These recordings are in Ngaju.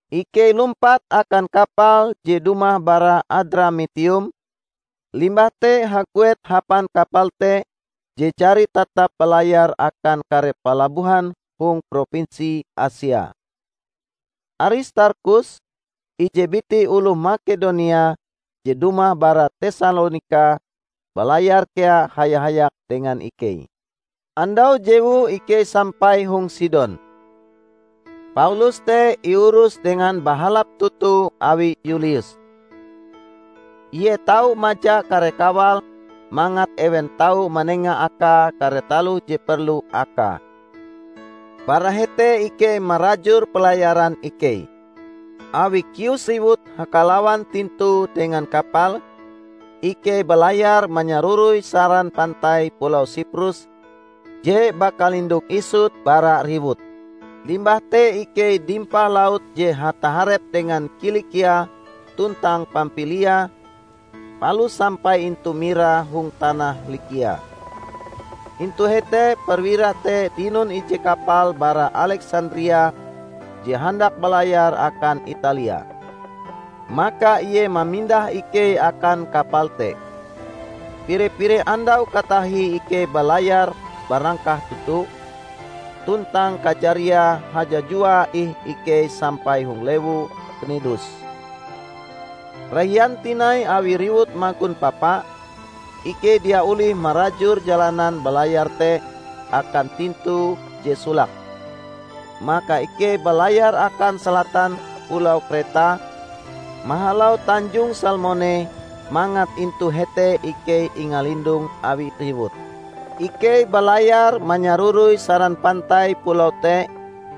Ikei lumpat akan kapal je dumah bara Adramitium, limbah te haguet hapan kapal te je jari tatap balayar akan kare palabohan hong propinsi Asia. Aristarkhus, ije biti oloh Makedonia je dumah bara Tesalonika, balayar kea haya-hayak dengan ikei. Andau jewue ikei sampai hong Sidon. Paulus te iurus dengan bahalap toto awi Yulius. Ie tau maja kare kawale mangat ewen tau manenga akae kare taloh je perlu akae. Bara hete ikei marajur pelayaran ikei. Awi kius riwut hakalawan tintue dengan kapal, ikei balayar manyaroroi saran pantai pulau Siprus je bakalindong isut bara riwut. Limbah te ikei dimpah laut je hataharep dengan Kilikia tuntang Pampilia palus sampai intu Mira hong tanah Likia. Intu hete perwira te dinon ije kapal bara Aleksandria je handak balayar akan Italia. Maka ie mamindah ikei akan kapal te. Pire-pire andau katahie ikei balayar barangkah toto, tuntang kajariae hajajuae ih ikei sampai hong lewu Knidus. Rahian tinai awi riwut magon papa, ikei dia olih marajur jalanan balayar te akan tintue je solake. Maka ikei balayar akan salatan pulau Kreta mahalau Tanjong Salmone mangat intu hete ikei ingalindong awi riwut. Ikei balayar manyaroroi saran pantai pulau te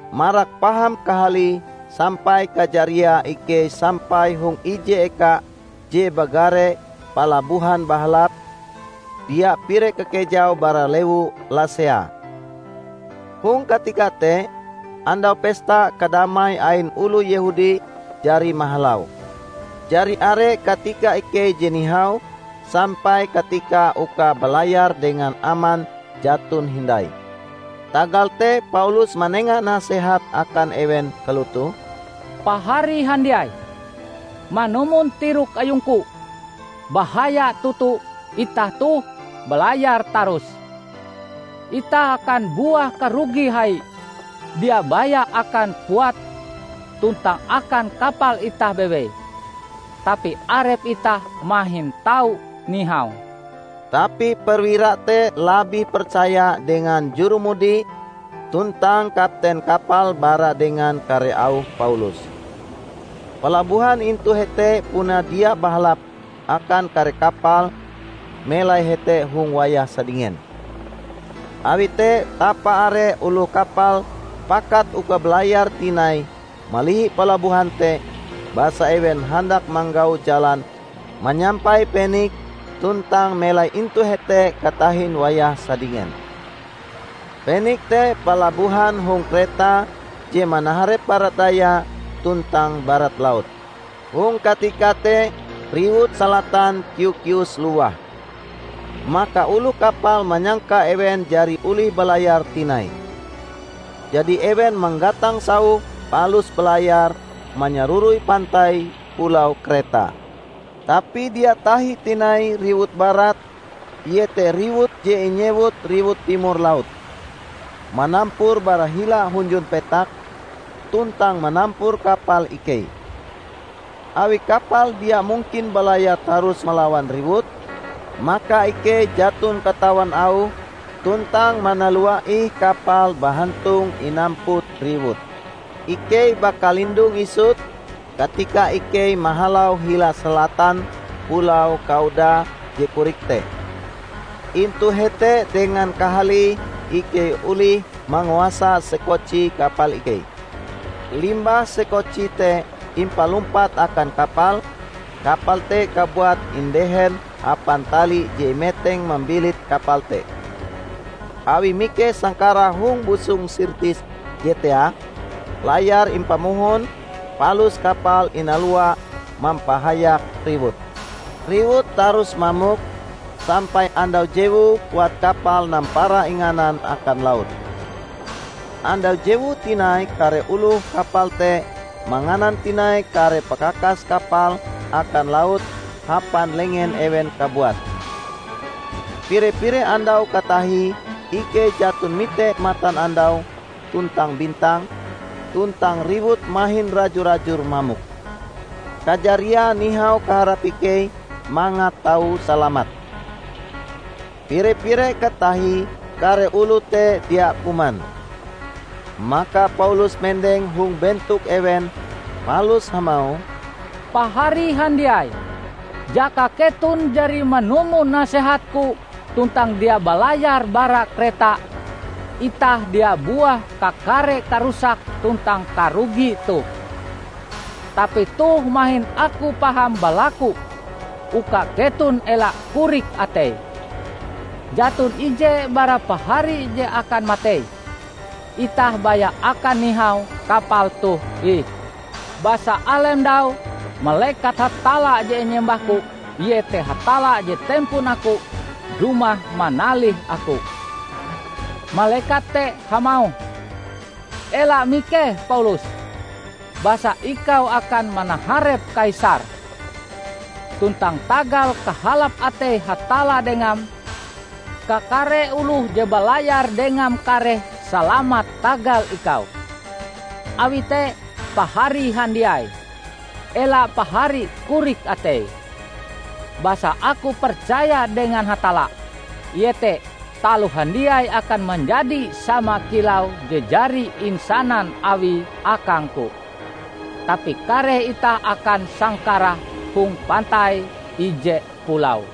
marak paham kahalie sampai kajariae ikei sampai hong ije eka je bagare Palabohan Bahalap, dia pire kakejaue bara lewu Lasea. Hong katika te, Andau Pesta Kadamai ain oloh Yehudi jari mahalau. Jari are katika ikei je nihau, sampai katika uka balayar dengan aman jaton hindai. Tagal te Paulus manenga nasehat akan ewen kalotoh, "Pahari handiai, manumon tirok ayungku, bahaya toto itah toh balayar tarus. Itah akan buah karugi hai, dia baya akan puat tuntang akan kapal itah bewei, tapi arep itah mahin tau nihau." Tapi perwira te labih percaya dengan jurumudi tuntang kapten kapal bara dengan kare auh Paulus. Palabohan intu hete puna dia bahalap akan kare kapal melai hete hong wayah sadingen. Awi te tapa-are oloh kapal pakat uka balayar tinai malihi palabohan te basa ewen handak manggau jalan manyampai Peniks tuntang melai intu hete katahin wayah sadingen. Peniks te palabohan hong Kreta je manaharep barat daya tuntang barat laut. Hong katika te riwut salatan kiu-kius lowah. Maka oloh kapal manyangka ewen jari olih balayar tinai. Jadi ewen manggatang sauh palus balayar manyaroroi pantai pulau Kreta. Tapi dia tahi tinai riwut barat -- iete riwut je inyewut riwut Timor Laut -- manampur bara hila hunjun petak, tuntang manampur kapal ikei. Awi kapal dia mungkin balayar tarus malawan riwut, maka ikei jaton katawan auh tuntang manalua ih kapal bahantong inamput riwut. Ikei bakalindong isut, katika ikei mahalau hila salatan pulau Kauda je korik te. Intu hete dengan kahalie ikei olih manguasa sekoci kapal ikei. Limbah sekoci te impalumpat akan kapal, kapal te kabuat indehen hapan tali je imeteng mambilit kapal te. Awi mikeh sangkarah hong busong Sirtis je teah, layar impamohon palus kapal inalua mampahayak riwut. Riwut tarus mamok, sampai andau jewue puat kapal nampara inganan akan laut. Andau jewue tinai kare oloh kapal te manganan tinai kare pakakas kapal akan laut hapan lengen ewen kabuat. Pire-pire andau katahie ikei jaton mite matanandau tuntang bintang, tuntang riwut mahin raju-rajur mamok. Kajariae nihau kaharap ikei mangat tau salamat. Pire-pire katahie kare oloh te dia kuman. Maka Paulus mendeng hong bentok ewen palus hamauh, "Pahari handiai! Jaka keton jari manumon nasehatku tuntang dia balayar bara Kreta, itah dia buah kakare karusak tuntang karugi toh. Tapi toh mahin aku paham balaku uka keton ela korik atei. Jaton ije bara pahari je akan matei; itah baya akan nihau kapal toh ih. Basa alem ndau, malekat Hatalla je inyembahku, iete Hatalla je tempon aku, dumah manalih aku. Malekat te hamauh, 'Ela mikeh Paulus! Basa ikau akan manaharep Kaisar. Tuntang tagal kahalap atei Hatalla dengam, kakare oloh je balayar dengam kareh salamat tagal ikau.' Awi te, pahari handiai, ela pahari korik atei! Basa aku percaya dengan Hatalla, iete, taloh handiai akan manjadi sama kilau je jari insanan Awie akangku. Tapi kareh itah akan sangkarah hong pantai ije pulau."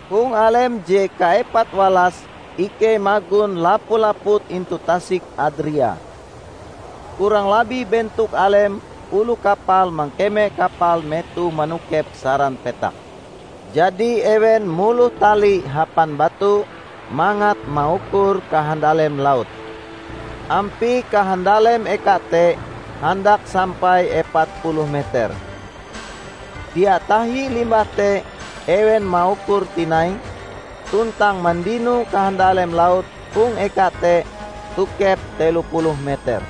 Hong alem je kaepat-walas ikei magon lapu-laput intu tasik Adria. Kurang labih bentok alem oloh kapal mangkeme kapal metohe manokep saran petak. Jadi ewen muloh tali hapan batu mangat maukur kahandalem laut. Ampie kahandalem eka te handak sampai epat puluh meter. Dia tahi limbah te ewen maukure tinai, tuntang mandino kahandalem laut hong eka te tokep telo puluh meter.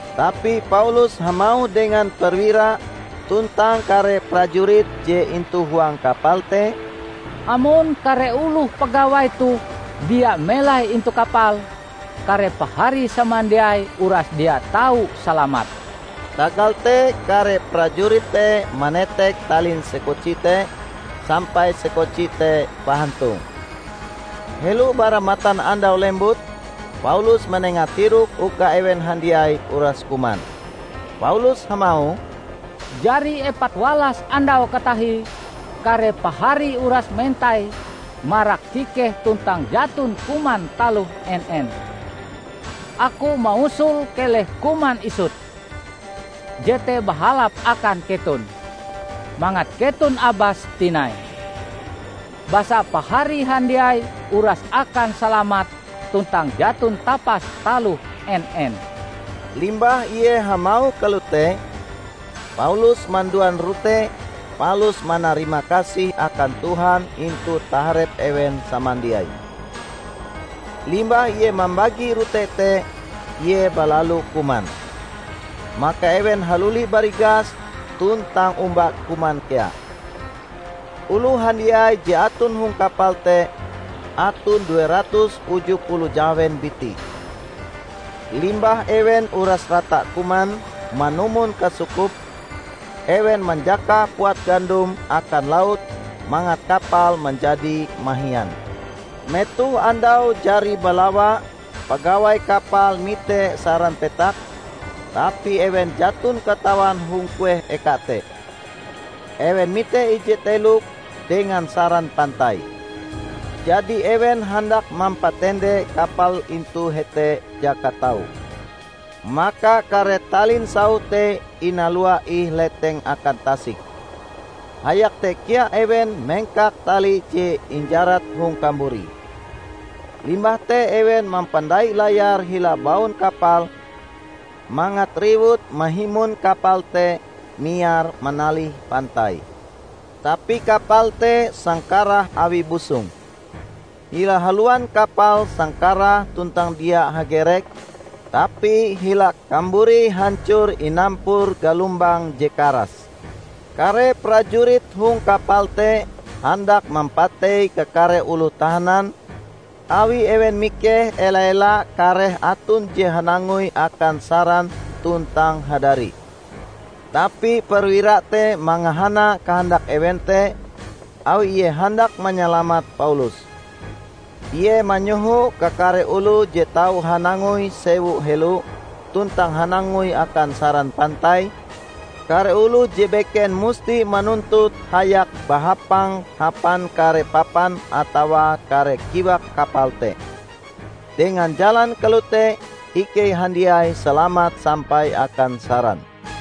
Tapi Paulus hamauh dengan perwira tuntang kare prajurit je intu huang kapal te, "Amon kare oloh pagawai toh dia melai intu kapal, kare pahari samandiai uras dia tau salamat." Tagal te kare prajurit te manetek talin sekoci te, sampai sekoci te bahantong. Helo bara matan andau lembut, Paulus manenga tirok uka ewen handiai uras kuman. Paulus hamauh, "Jari epat walas andau katahie kare pahari uras mentai marak kikeh tuntang jaton kuman taloh en-en. Aku mausul keleh kuman isut. Jete bahalap akan keton, mangat keton abas tinai. Basa pahari handiai uras akan salamat tuntang jaton tapas taloh en-en." Limbah ie hamauh kalote, Paulus manduan rote palus manarimakasih akan Tuhan intu taharep ewen samandiai. Limbah ie mambagi rote te, ie balalu kuman. Maka ewen haluli barigas tuntang omba kuman kea. Oloh handiai je aton hong kapal te aton due ratus uju puluh jahawen biti. Limbah ewen uras rata kuman manumon kasukupe, ewen manjakah puat gandom akan laut mangat kapal manjadi mahian. Metoh andau jari balawa pagawai kapal mite saran petak, tapi ewen jaton katawan hong kueh eka te. Ewen mite ije telok dengan saran pantai. Jadi ewen handak mampatende kapal intu hete jaka tau. Maka kare talin sauh te inalua ih leteng akan tasik. Hayak te kea ewen mengkak tali je injarat hong kamburi. Limbah te ewen mampandai layar hila baun kapal mangat riwut mahimon kapal te miar manalih pantai. Tapi kapal te sangkarah awi busong. Hila haluan kapal sangkarah tuntang dia hagerek, tapi hila kamburie hancor inampur galombang je karas. Kare prajurit hong kapal te handak mampatei kakare oloh tahanan, awi ewen mikeh ela-ela kareh aton je hanangoi akan saran tuntang hadari. Tapi perwira te mangahana kahandak ewen te awi ie handak manyalamat Paulus. Ie manyoho kakare oloh je tau hanangoi sewu helo tuntang hanangoi akan saran pantai; kare oloh je beken musti manuntut hayak bahapang hapan kare papan atawa kare kiwak kapal te. Dengan jalan kalote ikei handiai salamat sampai akan saran.